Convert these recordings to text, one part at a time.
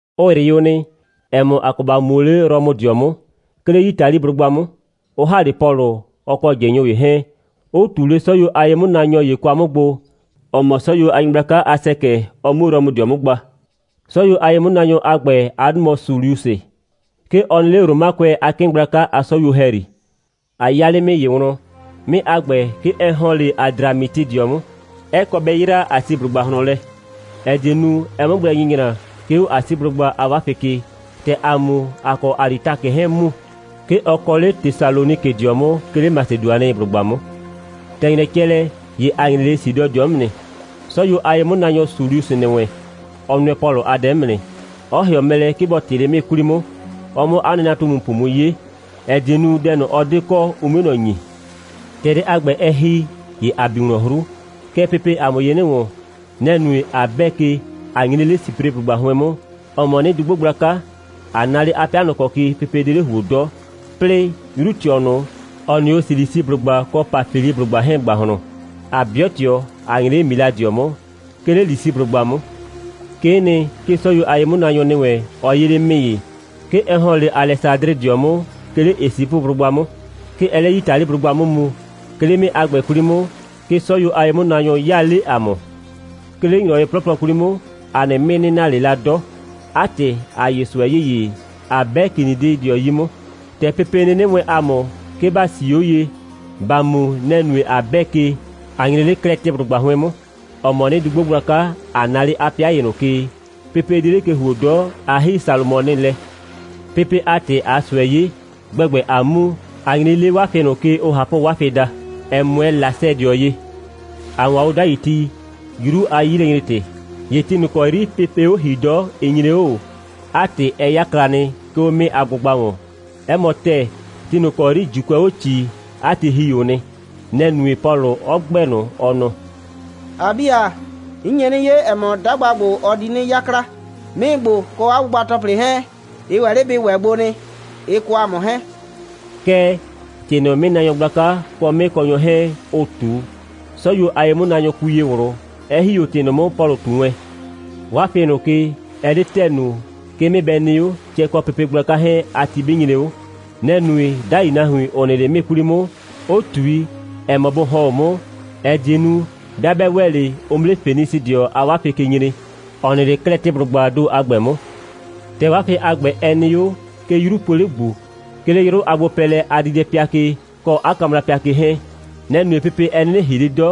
Ʋ ‑yrɩ o nɩ, ‑ɛ mɔ, ‑a kɔ ‑ba mu o 'le Rɔmʋdɩɔ 'mʋ, 'ke 'le Yitaliblʋgba 'mʋ, 'ʋ ‑ha 'le Pɔlʋ, ɔ kɔ ꞊jɩnyʋ ‑ye 'hɛɛn, 'ʋ ꞊tu 'le 'sɔyuo a ye'mʋnaanyɔ ‑ye kwa 'mʋ gbo, ‑ɔ mɔ 'sɔyuo a nyɩgblaka a ‑sɛkɛ, ɔ 'mu Rɔmʋdɩɔ 'mʋ gba. 'Sɔyuo a ye'mʋnaanyɔ a ‑gbɛ a 'dʋ mɔ Suliusɩ. 'Ke ɔ nɩ 'le Romakʋɛ a 'kɩɩn gblaka a 'sɔyuo ‑hɛyri. ‑A 'ya 'le 'mɩɩ ‑ye wlɔn. 'Mɩɩ a ‑gbɛ, 'ke ɛ ‑hɔn 'le Adramitɩdɩɔ 'mʋ, 'ɛ kɔ bɛ 'yraa Asiblʋgba ꞊hlɔn lɛ, ‑ɛ die nu, ɛ 'mʋ gblɛ nyɩnyra, 'ke 'o Asiblʋgba a 'wafɩi ke. ‑Tɛ ‑aa mu, ‑a kɔ Alitakɩ 'hɛɛn‑ mu. 'Ke ɔ kɔ 'le Tesalonikɩdɩɔ 'mʋ, 'ke 'le Masedʋanɩblʋgba 'mʋ. ‑Tɛ ‑nyrɛ cɛ lɛ, ‑ye ‑a nyre 'le Sidɔdɩɔ 'mʋ nɩ. 'Sɔyuo a ye'mʋnaanyɔ Suliusɩ ‑nɩ wɛn, ɔ nʋɛ Pɔlʋ a dɛ 'mʋ nɩ, 'ɔ ‑hɩɔ mɛ lɛ, 'ke bɔ ꞊tɩ 'le 'mɩɩ 'kwli 'mʋ, ɔ 'mʋ 'a nɩnatumupʋ mu 'ye, ‑ɛ die nu, dɛ ꞊nʋ, ɔ 'de kɔ, ʋ 'mue ꞊nɔ ‑nyi. ‑Tɛ dɛ a ‑gbɛ, ɛ ‑hi, ‑ye ‑a bi wlɔn 'hru. Kɛɛ, pepee ‑a mʋ ye 'nɩ ‑wɔn. Nɛ‑ nue, ꞊a 'bɛɛ ke, ꞊a nyre 'le Sipreblʋgba 'hʋɩn 'mʋ, ‑ɔ mɔ 'nɩdugbo gblaka, ꞊a na 'le 'a 'pɩa ꞊nʋ ‑kɔ ke pepe 'de 'le ‑huo 'dɔ, 'plɩɩ, 'yru꞊tɩɔ ꞊nʋ, ‑ʋ nɩ 'o Silisiblʋgba kɔ Pafiliblʋgba 'hɛɛn ‑gbahlɔn, ꞊a 'bɩʋ ꞊tɩɔ, ꞊a nyre 'le Miladɩɔ 'mʋ, 'ke 'le Lisiblʋgba 'mʋ. 'Kee nɩ, 'ke 'sɔyuo a ye'mʋnaanyɔ ‑nɩ wɛn, ɔ 'yee 'le 'mɩɩ ‑ye. 'Ke ɛ ‑hɔn 'le Alɛsadrɩdɩɔ 'mʋ, 'ke 'le Esipʋblʋgba 'mʋ. 'Ke ɛɛ 'le Yitaliblʋgba 'mʋ mu. 'Ke 'le 'mɩɩ a ‑gbɛ 'kwli 'mʋ, 'ke 'sɔyuo a ye'mʋnaanyɔ 'yaa 'le ‑a mʋ. 'Ke 'le ‑nyrɔwɩ 'plɔplɔ 'kwli 'mʋ, ‑a nɩ 'mɩɩ 'nɩ na ꞊le la 'dɔ. 'A ‑tɩ, ‑a 'ye ꞊sʋɛ ‑yeye, ꞊a 'bɛ Kinidɩdɩɔ 'yi 'mʋ. ‑Tɛ pepe 'nɩnɩ wɛɛn ‑a mʋ, 'ke ‑ba 'sii 'o ye, ‑ba mu, nɛ‑ nue, ꞊a 'bɛɛ ke, ꞊a nyre 'le Klɛtɩblʋgba 'hʋɩn 'mʋ, ‑ɔ mɔ 'nɩdugbo gblaka, ꞊a na 'le 'a 'pɩa ‑ye ꞊nʋ ke, pepe 'de 'le ke ‑huo 'dɔ, ꞊a ‑hi Salʋmɔnɩ lɛ. Pepe a ‑tɩ, ꞊aa ꞊sʋɛ 'ye, gbɛgbɛ ꞊aa mu, ꞊a nyre 'le 'wafɩ ꞊nʋ ke, ʋʋ ꞊Hapʋ'wafɩ daa, 'ɛ 'mʋɛɛ Lasɛdɩɔ ye. ‑A 'waan o 'dai ti, 'yru a 'yilɛnyre‑tɩ. ‑Ye ti ꞊nʋ ‑kɔ 'yri pepee 'o ‑hii 'dɔ, ɩ nyre 'o ꞊o. 'A ‑tɩ, ɛ 'yakla nɩ, 'ke 'o 'mɩɩ a gbʋgba ‑wɔn. 'Ɛ mɔ ‑tɛɛ, ti ꞊nʋ ‑kɔ 'yri ‑Juukʋɛ 'o ꞊cii, 'a ti ‑hi o nɩ. Nɛ‑ nue, Pɔlʋ 'ɔ ‑gbɛɛ ꞊nʋ, ɔ nɔ: «‑A 'bi ‑a, 'n nye 'nɩ 'ye, ‑ɛ mɔ, 'dagba ‑gbo, ɔ di 'nɩ 'yakla. 'Mɩɩ ‑gbo, kɔ 'a gbʋgba‑tɔplɩ 'hɛɛn, ɩ ‑wɛ 'le bɩ ‑wɛ gbo nɩ, ɩ kɔ ‑a mʋ 'hɛɛn.» Kɛɛ, ‑tɩ ꞊nʋ, 'mɩɩnaanyɔ gblaka kɔ 'mɩɩkɔnyɔ 'hɛɛn, ʋ ꞊tu, 'sɔyuo a ye'mʋnaanyɔ kui ye ꞊wlʋ, 'ɛ ‑hi 'o ‑tɩ ꞊nʋ 'mʋ, Pɔlʋ ꞊tu wɛn. 'Wafɩ ꞊nʋ ke, ɛ 'de ‑tɛɛ nu, 'ke 'mɩɩ bɩ nɩ 'o, cɛ kɔ pepe gblaka 'hɛɛn a ti 'bɩ nyre 'o. Nɛ‑ nue, 'dai nahuin, ‑ʋ nɩ 'le 'mɩɩ ꞊nʋ 'kwli 'mʋ, 'ʋ ꞊tui, ‑ɛ mɔ, bʋ ‑hɔn 'o 'mʋ, ‑ɛ die nu, 'bɩa 'bɛ ‑wɛ 'le, ʋ 'mʋ 'le Fenisɩdɩɔ a 'wafɩ ke nyre, ‑ɔ nɩ 'le Klɛtɩblʋgbaa ‑do a ‑gbɛ 'mʋ. ‑Tɛ 'wafɩ a ‑gbɛ nɩ 'o, 'ke 'yru poo 'le ‑gbu, 'ke 'le 'yrʋ a gbopɛɛlɛ a diidɛpɩa ke, kɔ 'a kamrapɩa ke 'hɛɛn. Nɛ‑ nue, pepe 'ɛ 'nɩnɩ ‑hii 'le 'dɔ,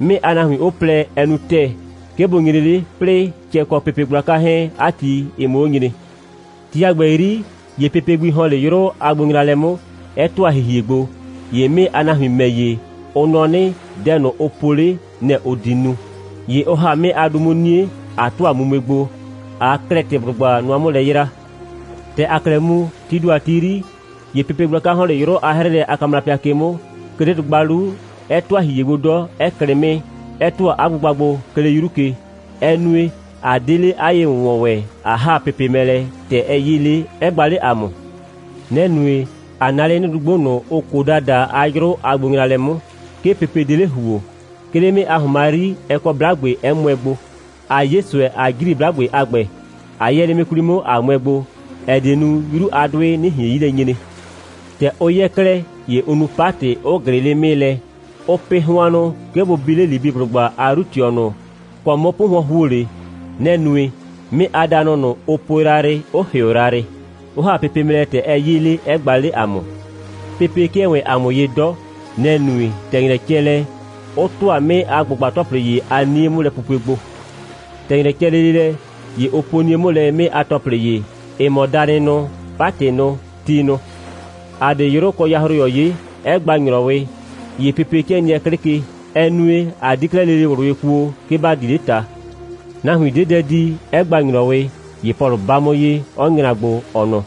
'mɩɩ a nahuin 'ʋ plɛ, ɛ nu ‑tɛɛ, 'ke bʋ nyre 'le, 'plɩɩ cɛ kɔ pepe gblaka 'hɛɛn a ti, ɩ 'mʋ 'o nyre. Ti a ‑gbɛ 'yri, ‑ye pepe gbi ‑hɔn 'le 'yrʋ a gbonyraalɛ 'mʋ, 'ɛ ‑tʋa ‑hihie gbo. ‑Ye 'mɩɩ a nahuin ‑mɛ ‑ye, ʋ nɔ 'nɩ, dɛ ꞊nʋ, ʋ po 'le, nɛ‑ ʋ di nu. ‑Ye ʋ ‑ha 'mɩɩ a du 'mʋ 'nie, ꞊a ‑tʋa mumue gbo, ꞊aa Klɛtɩblʋgba nʋa 'mʋ lɛ 'yraa. ‑Tɛ ‑aa 'klɛɛ mu, tii ‑do a ti 'yri, ‑ye pepe gblaka ‑hɔn 'le 'yrʋ a 'hrɩɩlɛ a kamrapɩa ke 'mʋ, 'ke 'le dʋgba 'lu, 'ɛ ‑tʋa ‑hihie gbo 'dɔ, 'ɛ klɩ 'mɩɩ, 'ɛ ‑tʋa 'a gbʋgba gbo, 'ke 'le 'yru ke. Ɛ nue, ‑a 'de 'le 'a ye‑wʋnwɔn ‑wɛ, ꞊a ‑ha pepe mɛ lɛ, ‑tɛ ɛ 'yee 'le, 'ɛ gba 'le ‑a mʋ. Nɛ‑ nue, ꞊a na 'le 'nɩdugbo ꞊nʋ, ʋʋ Koda daa a 'yrʋ a gbonyraalɛ 'mʋ. 'Ke pepe 'de 'le ‑huo. 'Ke 'le 'mɩɩ a ‑hʋnma 'yri, ɛ kɔ 'blagbe, 'ɛ mʋɛ gbo. ‑A 'ye ꞊sʋɛ, ꞊a ‑jri 'blagbe a ‑gbɛ, ꞊a 'yɛɛ 'le 'mɩɩ 'kwli 'mʋ, ꞊a mʋɛ gbo, ‑ɛ die nu, 'yru a 'dʋɩ 'nɩ ꞊hien 'yi lɛ nyre. ‑Tɛ ʋ 'yɛɛ 'klɛɛ, ‑ye ʋ nu 'patɩ, 'ʋ ꞊glɩɩ 'le 'mɩɩ lɛ. Ʋʋ pɩ hʋannʋ, 'ke bʋ bi 'le Libiblʋgba a 'yru꞊tɩɔ ꞊nʋ ‑kɔ 'mʋ 'pʋhʋɔn ‑huo 'le. Nɛ‑ nue, 'mɩɩ a danʋ ꞊nʋ, ʋ po yrayrɩ, 'ʋ ‑hɩʋ yrayrɩ, 'ʋ ‑ha pepe mɛ lɛ, ‑tɛ ɛ 'yee 'le, 'ɛ gba 'le ‑a mʋ. Pepe 'kɩɛ ‑wɛɛn ‑a mʋ ye 'dɔ. Nɛ‑ nue, ‑tɛ ‑nyrɛ cɛ lɛ, ʋ ‑tʋa 'mɩɩ a gbʋgba‑tɔplɩ ‑ye a 'nie a 'mʋlɛpupue gbo. ‑Tɛ ‑nyrɛ cɛ lele lɛ, ‑ye ʋ po 'nie 'mʋ lɛ 'mɩɩ a ‑tɔplɩ ‑ye, ‑ɩ mɔ danɩ nʋ, 'patɩ nʋ, ti nʋ. ‑A 'de 'yrʋ kɔ yahroyɔ 'ye, 'ɛ gba ‑nyrɔwɩ, ‑ye pepe 'kɩɛ nɩɛ 'klɩ ke. Ɛ nue, ꞊a 'die 'klɛɛ lele ꞊wlʋ ye kuo, 'ke ‑ba di 'le ꞊ta. Nahuin 'de dɛ di, 'ɛ gba ‑nyrɔwɩ. ‑Ye Pɔlʋ 'ba 'mʋ ye, 'ɔ nyra gbo, ɔ nɔ: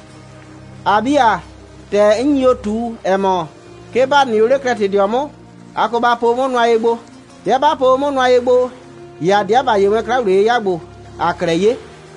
«‑A 'bi ‑a, ‑tɛ 'n nyi o ꞊tu, ‑ɛ mɔ, 'ke ‑ba nɩ o 'le Klɛtɩblʋgba 'mʋ, a kɔ ba po o 'mʋ nʋa ye gbo. 'Bɩa 'ba po o 'mʋ nʋa ye gbo, ‑ye ‑a 'deɛ ‑ba 'ye wɛn 'kla‑wliye'yɩya ‑gbo, ‑aa 'klɛɛ 'ye.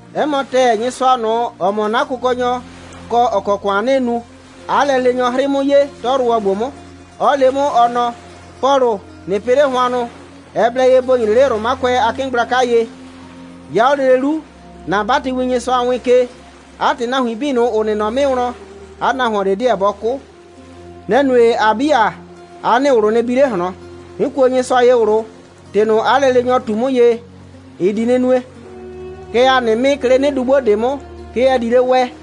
'Ɛ mɔ ‑tɛɛ, Nyɩsʋa ꞊nʋ, ‑ɔ mɔ 'na Kʋkɔnyɔ, kɔ, ‑ɔ kɔ ‑kʋan 'nɩɩ nu, 'a lɛleenyɔ 'hrɩɩ 'mʋ ye, 'tɔyrʋwɔ ‑gbo 'mʋ, 'ɔ le 'mʋ, ɔ nɔ: Pɔlʋ, ꞊nɩ pɩ 'le hʋannʋ. Ɛ blɛ ye ‑bo nyre 'le Romakʋɛ a 'kɩɩn gblaka ye. 'Ya 'o lele 'lu, ‑na 'batɩwin, Nyɩsʋa wɩɩn ke. 'A ‑tɩ, nahuin 'bii ꞊nʋ, ‑ʋ nɩ nɔ 'mɩɩ wlɔn, 'a nahuon ꞊de 'deɛ bɔ 'kʋ. Nɛ‑ nue, ‑a 'bi ‑a, 'a nɩ ꞊wlʋ nɩ bi 'le ꞊hlɔn. 'N kuo Nyɩsʋa ye ꞊wlʋ. ‑Tɩ ꞊nʋ, 'a lɛleenyɔ ꞊tu 'mʋ ye, ɩ di 'nɩ nue. Kɛɛ, ‑a nɩ 'mɩɩ, 'ke 'le 'nɩdugbo ꞊de 'mʋ, 'ke ɛ di 'le wɛɛ.»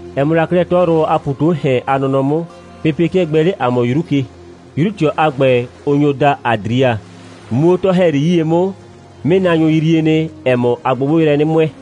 Ɛ mɔ la 'klɛɛ 'tɔyrʋwɔ a ‑pu ꞊tu 'o ‑hɛn a nɔnɔ 'mʋ, pepe 'kɩɛ gbɛɛ 'le ‑a mʋ 'yru ke. 'Yru꞊tɩɔ a ‑gbɛ, ʋ nyo daa Adria. Muu 'o 'tɔ‑hɛyri 'yie 'mʋ, 'mɩɩnaanyʋ yree nɩ, ‑ɛ mɔ, ‑aa gbogbo yrɛ 'nɩ 'mʋɛɛ,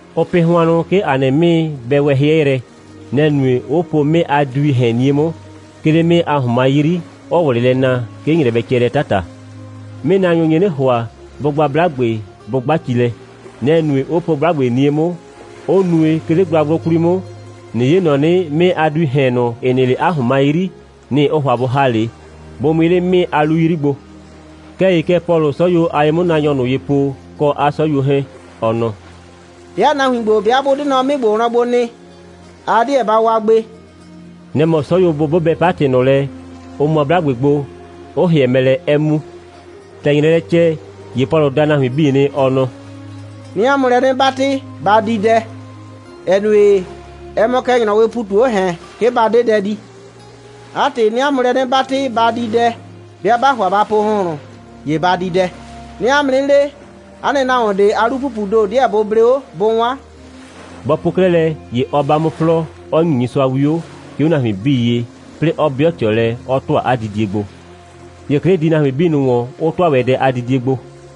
Ʋʋ pɩ hʋannʋ, 'ke ‑a nɩ 'mɩɩ bɛ wɛ 'hɩɛ yrɛ. Nɛ‑ nue, 'ʋ po 'mɩɩ a duii ‑hɛn 'nie 'mʋ, 'ke 'le 'mɩɩ a ‑hʋnma 'yri, 'ʋʋ ꞊wlɩ lɛ naa, 'ke ‑nyrɛ bɛ cɛ lɛ 'tata. 'Mɩɩnaanyʋ nye 'nɩ ‑hʋa, bʋ gba 'blagbe, bʋ 'gba ci lɛ. Nɛ‑ nue, 'ʋ po 'blagbe 'nie 'mʋ, 'ʋ nue, 'ke 'le gblagblʋ 'kwli 'mʋ, ꞊nɩ 'ye ‑nɔ 'nɩ, 'mɩɩ a duii ‑hɛn ꞊nʋ, ‑ɩ nɩ 'le 'a ‑hʋnma 'yri, nɩ‑ ʋʋ ‑hʋa bʋ ‑ha 'le, bʋ mʋɩ 'le 'mɩɩ a 'lu 'yri gbo. Kɛɛ ‑ye kɛ Pɔlʋʋ 'sɔyuo a ye'mʋnaanyɔ ꞊nʋ ye po, kɔ 'a 'sɔyuo 'hɛɛn, ɔ nɔ: «'Bɩa nahuin ‑gbo, 'bɩa 'bʋ 'de nɔ 'mɩɩ ‑gbo wlɔn gbo nɩ, a 'deɛ ba wa gbe.» Nɛ‑ mɔ 'sɔyuo bʋ 'bʋbɛ 'patɩ ꞊nʋ lɛ, ʋ mʋa 'blagbe gbo, 'ʋ ‑hɩɛ mɛ lɛ, 'ɛ mu. ‑Tɛ ‑nyrɛɛ lɛ cɛ, ‑ye Pɔlʋ da nahuin 'bii nɩ, ɔ nɔ: «'Nɩɩ 'a mʋ lɛ 'nɩ 'batɩ, ba di dɛ, ‑ɛ nue, ɛ mɔ kɛ ‑nyrɔwɩɩ ‑pu ꞊tu 'o ‑hɛn, 'ke ba 'de dɛ di. 'A ‑tɩ, 'nɩɩ 'a mʋ lɛ 'nɩ 'batɩ, ba di dɛ. 'Bɩa 'baa ‑hʋa ba po ‑hʋnhlʋn, ‑ye ba di dɛ. 'Nɩɩ 'a mʋ 'nɩ le, 'a nɩ nahuon ꞊de a 'lu‑pupuu ‑do ꞊de 'deɛ bʋ ble 'o, bʋ 'wan.» Bɔ po 'klɛɛ lɛ, ‑ye ɔ 'ba 'mʋ 'flɔɔ, 'ɔ ‑nyi Nyɩsʋa 'wio, 'ke 'o nahuin 'bii ye, 'plɩɩ 'ɔ 'bɩɔ ꞊tɩɔ lɛ, 'ɔ ‑tʋa 'a didie gbo. ‑Ye 'klɩ di nahuin 'bii ‑wɔn, 'ʋ ‑tʋa ‑wɛ dɛ a didie gbo.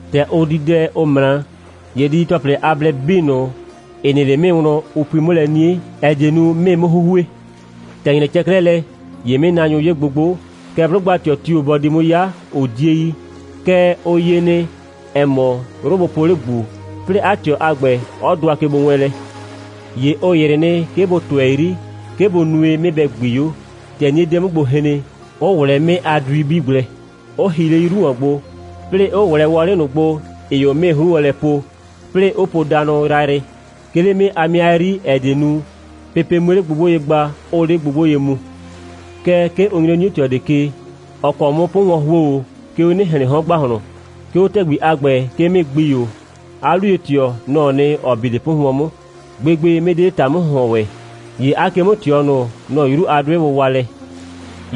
‑Tɛ ʋ di dɛ, ʋ ꞊mra, ‑ye didi‑tɔplɩ a blɛ 'bii ꞊nʋ, ‑ɩ nɩ 'le 'mɩɩ wlɔn, ʋ pui 'mʋ lɛ 'nie, ‑ɛ die nu, 'mɩɩ 'mʋ 'huhue. ‑Tɛ ‑nyrɛ cɛ 'klɛɛ lɛ, ‑ye 'mɩɩnaanyʋ 'ye gbogbo, kɛɛ, 'blʋgba꞊tɩɔ tio‑ bɔ di 'mʋ 'ya, ʋ 'die yi. Kɛɛ, ʋ 'ye nɩ, ‑ɛ mɔ, 'yru po 'le ‑gbu, 'plɩɩ 'a ꞊tɩɔ a ‑gbɛ, ɔ dʋa kegbowɛɛnlɛ. ‑Ye ʋ ‑yrɩ nɩ, 'ke bʋ ꞊tʋɛ 'yri, 'ke bʋ nue, 'mɩɩ bɛ ‑gbii 'o, ‑tɛ 'nie 'de 'o 'mʋ gbo hren, 'ʋ ꞊wlɛɛ 'mɩɩ a dui 'bii gblɛ, 'ʋ hi 'le 'yru ‑wɔn gbo, 'plɩɩ 'ʋ ꞊wlɛɛ wɔlɩ ꞊nʋ gbo, ‑ɩɩ 'o 'mɩɩ 'hru wlɔn lɛ po, 'plɩɩ 'ʋ po danʋ yrayrɩ, 'ke 'le 'mɩɩ a 'mɩa 'yri, ‑ɛ die nu, pepe 'mue gbogbo ye gba, 'ʋʋ 'le gbogbo ye mu. Kɛɛ, 'ke ʋ nyre 'o 'nie꞊tɩɔ ꞊de ke, ‑ɔ kɔ 'mʋ 'pʋhʋɔn ‑huo 'o, 'ke 'o 'nɩ‑hlɩɩn 'hɔn ‑gbahlɔn. 'Ke 'o ‑tɛgbi a ‑gbɛ, 'ke 'mɩɩ ‑gbii 'o. 'A 'luye꞊tɩɔ, nɔ‑ɔ nɩ, ‑ɔ bi 'le 'pʋhʋɔn 'mʋ. Gbegbe, 'mɩɩ 'de 'le ‑ta'mʋ‑hʋhɔn ‑wɛ. ‑Ye 'a ke'mʋ꞊tɩɔ ꞊nʋ, nɔ‑ 'yru a 'dʋɩ wʋwa lɛ.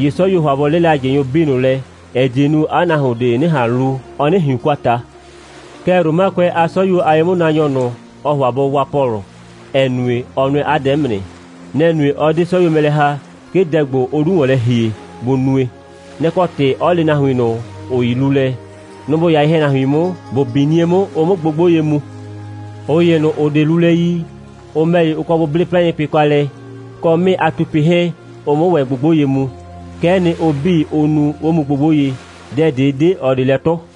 ‑Ye 'sɔyuoo ‑hʋa bʋ 'lɩla ꞊jɩnyʋ 'bii ꞊nʋ lɛ, ‑ɛ die nu, 'a nahuon ꞊de 'nɩ ꞊han lu, ɔ 'nɩ ꞊hiun kwa ꞊ta. Kɛɛ, Romakʋɛ a 'sɔyuo a ye'mʋnaanyɔ ꞊nʋ, ɔɔ ‑hʋa bɔ waa Pɔlʋ, ‑ɛ nue, ɔ nʋɛ 'a dɛ 'mʋ nɩ. Nɛ‑ nue, 'ɔ 'de 'sɔyuo mɛ lɛ ‑ha, 'ke dɛ ‑gbo, ʋʋ 'lu ‑wɔn lɛ ‑hie, bʋ nue. Nɛ‑ kɔ ‑tɩ, 'ɔ le nahuin ꞊nʋ, ‑ʋ yi lulɛ, nʋ‑ ‑bʋ 'ya ye‑hɛnahuin 'mʋ, ‑bʋ bi 'nie 'mʋ, ʋ 'mʋ gbogbo ye mu. ꞊Ʋ ‑ye ꞊nʋ, ‑ʋ 'de lulɛ yi, ʋ ‑mɛ ‑ye, ʋ kɔ bʋ 'ble 'plaɩnpɩ kwa lɛ, kɔ 'mɩɩ a tupɩ 'hɛɛn, ʋ 'mʋ ‑wɛ gbogbo ye mu. Kɛ'ɛ nɩ, ʋ 'bii, ʋ nu, 'ʋ mu gbogbo ye. Dɛ ꞊de 'de ꞊ɔ ꞊de lɛ 'tʋ.